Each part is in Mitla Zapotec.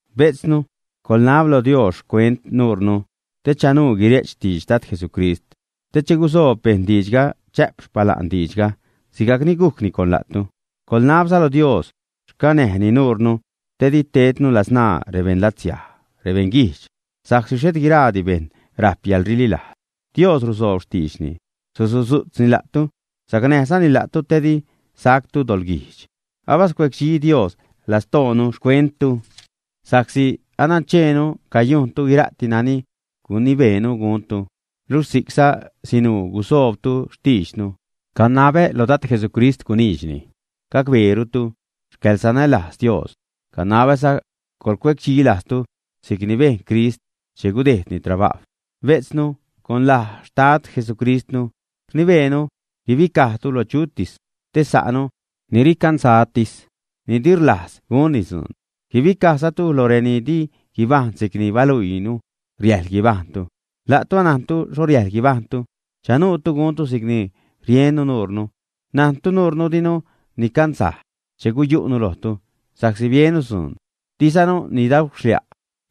Bejtznu, coḻnab lo Dios xcuent nuurnu te chanuu guire'ch xtidx Dad Jesucrist, te che gusoob bejṉ diidxga chä'p xpala'n diidxga, sigajcni gujcni con la'tu. Coḻnabza lo Dios xcanäjni nuurnu te di tednu ladzṉaa rebeṉlatsiaj, rebeṉguijdx, sa'csi xhet guiraadi bejṉ rajp yäḻrililajz. Dios rusoob xtiidxni, susudzu'tzni la'tu, sacnäjzani la'tu te di sactu doḻguijdx. Abascuedxi Dios lastoonu xcuenttu sa'csi anancheenu cayujntu guira'ti nani gunibeenu guntu, luxh si'cza sinuu gusoobtu xtiidxnu. Canabä lo Dad Jesucrist guniidxni gacbeerutu xcäḻsanälajz Dios, canabäza coḻcuecdxi lajztu si'cni bejn Crist che gudejdni trabajw. Bejtznu, con laj Xtad Jesucristnu, rnibeenu guibicajtu lo chutis te sa'nu ni ricanzajtis, ni di rlajz gunni dzuun. Guibicajzatu loj reni di guibajṉ si'cni baluiinu riäjḻ guibajṉtu. La'tu anajntu xho riäjḻ guibajṉtu, chanuutu guntu si'cni riennu nuure. Najntu nuurnu dinu nicanzaj che guyu'nu lojtu sa'csi biennu dzuun. Dizanu nidauxlia'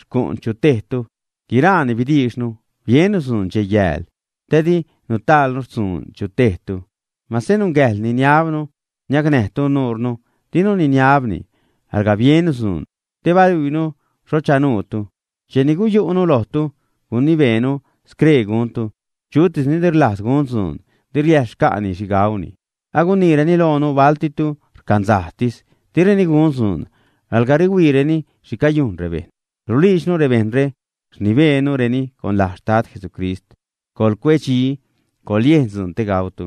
xcu'n chu tejtu; guiraani bidiixnu, biennu dzuun dxej-yääl, te di nutaalnu xtzuun chu tejtu. Masä nungäjḻ niniabnu niacnäjtu nuurnu, dinu niniabni; alga biennu dzuun te baluiinu xho chanuutu. Cheni guyu'nu lojtu, gunibeenu scree guntu: Chutis ni di rlajz gun dzuun di riäjḻ xca'ni xhi gauni. Aguniireni loonu baltitu rcanzajtis, direni gun dzuun, alga rihuiireni xhi cayujn rebejṉ. Rulijdxnu rebejṉre, rnibeenureni con laj Xtad Jesucristnu: coḻcuedxi, coḻyejn dzuun te gautu.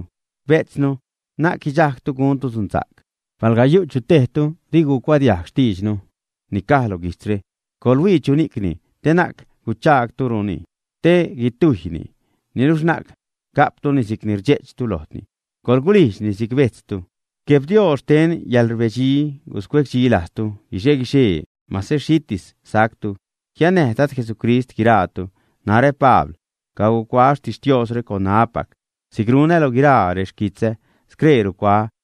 Bejtznu, na'c guidxajgtu guntu dzunsa'c. Palga yu' chu tejtu di gucuadiajg xtiidxnu ni caj lo guijtzre, coḻhuii chuni'cni te na'c guchaagtuni, te guitujyni. Niluxh na'c ga'ptuni si'c ni rdxe'ch lojtu, coḻguliidxni si'c bejtztu. Gueb Dios xten yäḻrbedxi, guscuecdxi lajztu guixe-guixee, masä xhitis sajctu. Jiannäj Dad Jesucrist guiraatu. Narä, Pabl cacuaä xtixtiosre con ṉaäpac si'c runä lo guiraa rexquitzä, scree rucuaä.